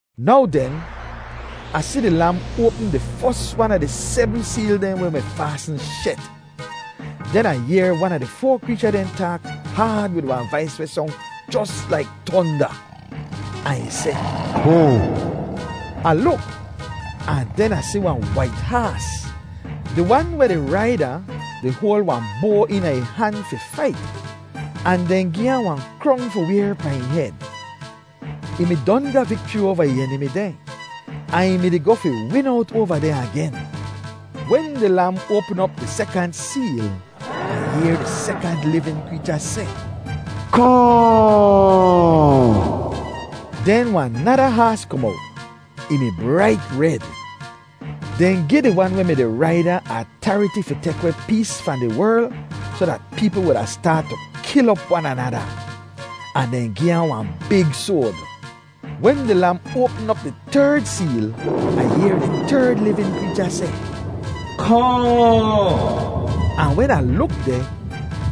Now den, Ah si di Lam oapm di fos wan a di sebm seel dehn weh mi faasn shet. Den Ah yehr wan a di foa kreecha dehn taak haad wid wahn vais weh song jos laik tonda, ahn ih seh, “Kohn!” Ah luk, ahn den Ah si wahn wait haas. Di wan weh di raid ahn, di hoal wahn boa eena ih han fi fait. Ahn dehn gi ahn wahn krong fi wayr pahn ih hed. Ih mi don ga vikchri oava ih enimi dehn, ahn ih mi-di goh fi win owt oava dehn agen. Wen di Lam oapm op di sekant seel, Ah yehr di sekant livin kreecha seh, “Kohn!” Den wahn nada haas kom owt. Ih mi brait red. Dehn gi di wan weh mi-di raid ahn atariti fi tek weh pees fahn di werl soh dat peepl wuda staat tu kil op wan anada. Ahn dehn gi ahn wahn big soad. Wen di Lam oapm op di terd seel, Ah yehr di terd livin kreecha seh, “Kohn!” Ahn wen Ah luk deh,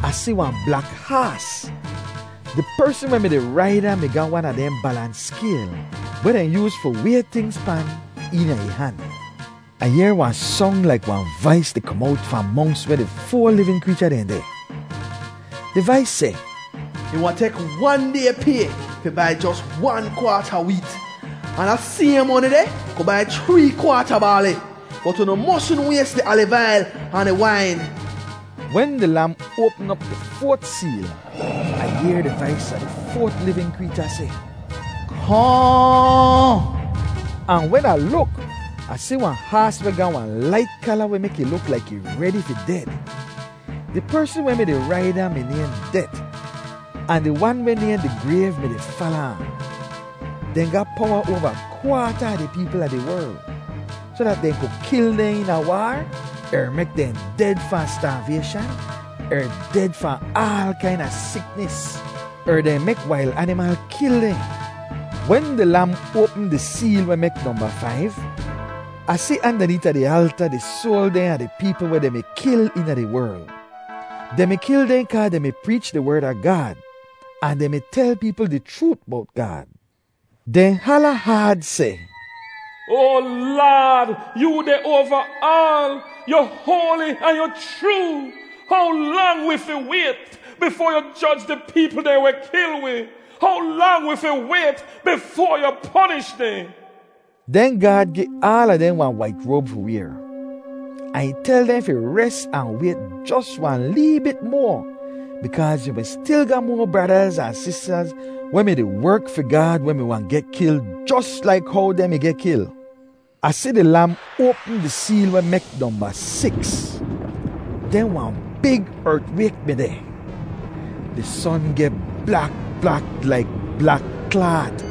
Ah si wahn blak haas! Di persn weh mi-di raid ahn mi ga wan a dehn balans skayl, weh dehn yooz fi way tingz pan, eena ih han. Ah yehr wahn song laik wahn vais di kom owt fahn monks weh di foa livin kreecha dehn deh. Di vais seh, “Ih wahn tek wan day pay fi bai jos wan kwaat a weet; ahn da sayhn moni deh ku bai chree kwaat a baali. Bot unu mosn ways di aliv ail ahn di wain.” Wen di Lam oapm op di foat seel, Ah yehr di vais a di foat livin kreecha seh, “Kohn!” Ahn wen Ah luk, Ah si wahn haas weh ga wahn lait kala weh mek ih luk laik ih redi fi ded! Di persn weh mi-di raid ahn mi nayhn Det, ahn di wan weh nayhn di Grayv mi-di fala ahn. Dehn ga powa oava kwaata a di peepl a di werl, soh dat dehn ku kil dehn eena waar, er mek dehn ded fahn staavayshan, er ded fahn aal kaina siknis, er dehn mek wail animal kil dehn. Wen di Lam oapm di seel weh mek nomba faiv, Ah si andaneeta di alta, di soal dehn a di peepl weh dehn mi kil eena di werl. Dehn mi kil dehn kaa dehn mi preech di Werd a Gaad, ahn dehn mi tel peepl di chroot bowt Gaad. Dehn hala haad seh, “Oa Laad, yoo deh oava aal! Yu hoali ahn yu chroo! How lang wi fi wayt bifoa yu joj di peepl dehn weh kil wi? How lang wi fi wayt bifoa yu ponish dehn?” Den Gaad gi aala dehn wahn wait roab fi wayr. Ahn ih tel dehn fi res ahn wayt jos wahn lee bit moa bikaaz yu mi stil ga moa bradaz ahn sistaz weh mi-di werk fi Gaad weh mi wahn geh kil jos laik how dehn mi geh kil. Ah si di Lam oapm di seel weh mek nomba siks. Den wahn big ertwayk mi deh. Di son geh blak blak laik blak klaat.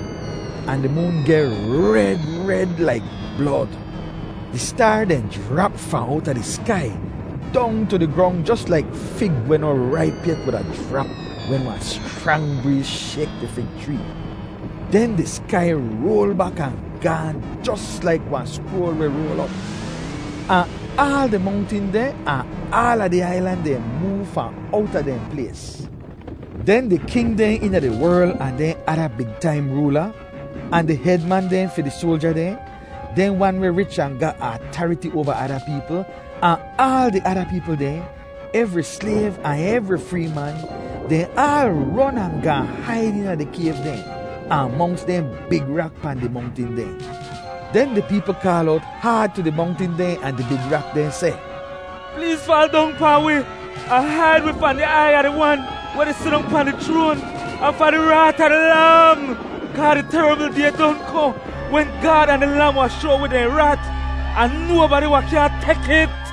Ahn di moon geh red red laik blod. Di staar dehn jrap fahn owta di skai, dong tu di grong jos laik fig weh noh raip yet wuda jrap wen wahn schrang breez shayk di fig chree. Den di skai roal bak ahn gaahn jos laik wahn skroal weh roal op. Ahn aal di mongtin dehn ahn aala di ailan dehn moov fahn owta dehn plays. Den di king dehn eena di werl ahn dehn ada big taim roola, ahn di hed man dehn fi di soalja dehn, dehn wan weh rich ahn ga atariti oava ada peepl, ahn aal di ada peepl dehn, evri slayv ahn evri free man, dehn aal ron ahn gaahn haid eena di kayv dehn, ahn monks dehn big rak pahn di mongtin dehn. Den di peepl kaal owt haad tu di mongtin dehn ahn di big rak dehn seh, “Pleez faal dong pahn wi ahn haid wi fahn di aiy a di Wan weh di sidong pahn di chroan, ahn fahn di raat a di Lam! Kaa di terabl Day don kohn wen Gaad ahn di Lam wahn shoa wi dehn raat ahn nobadi wahn kyaahn tek it.”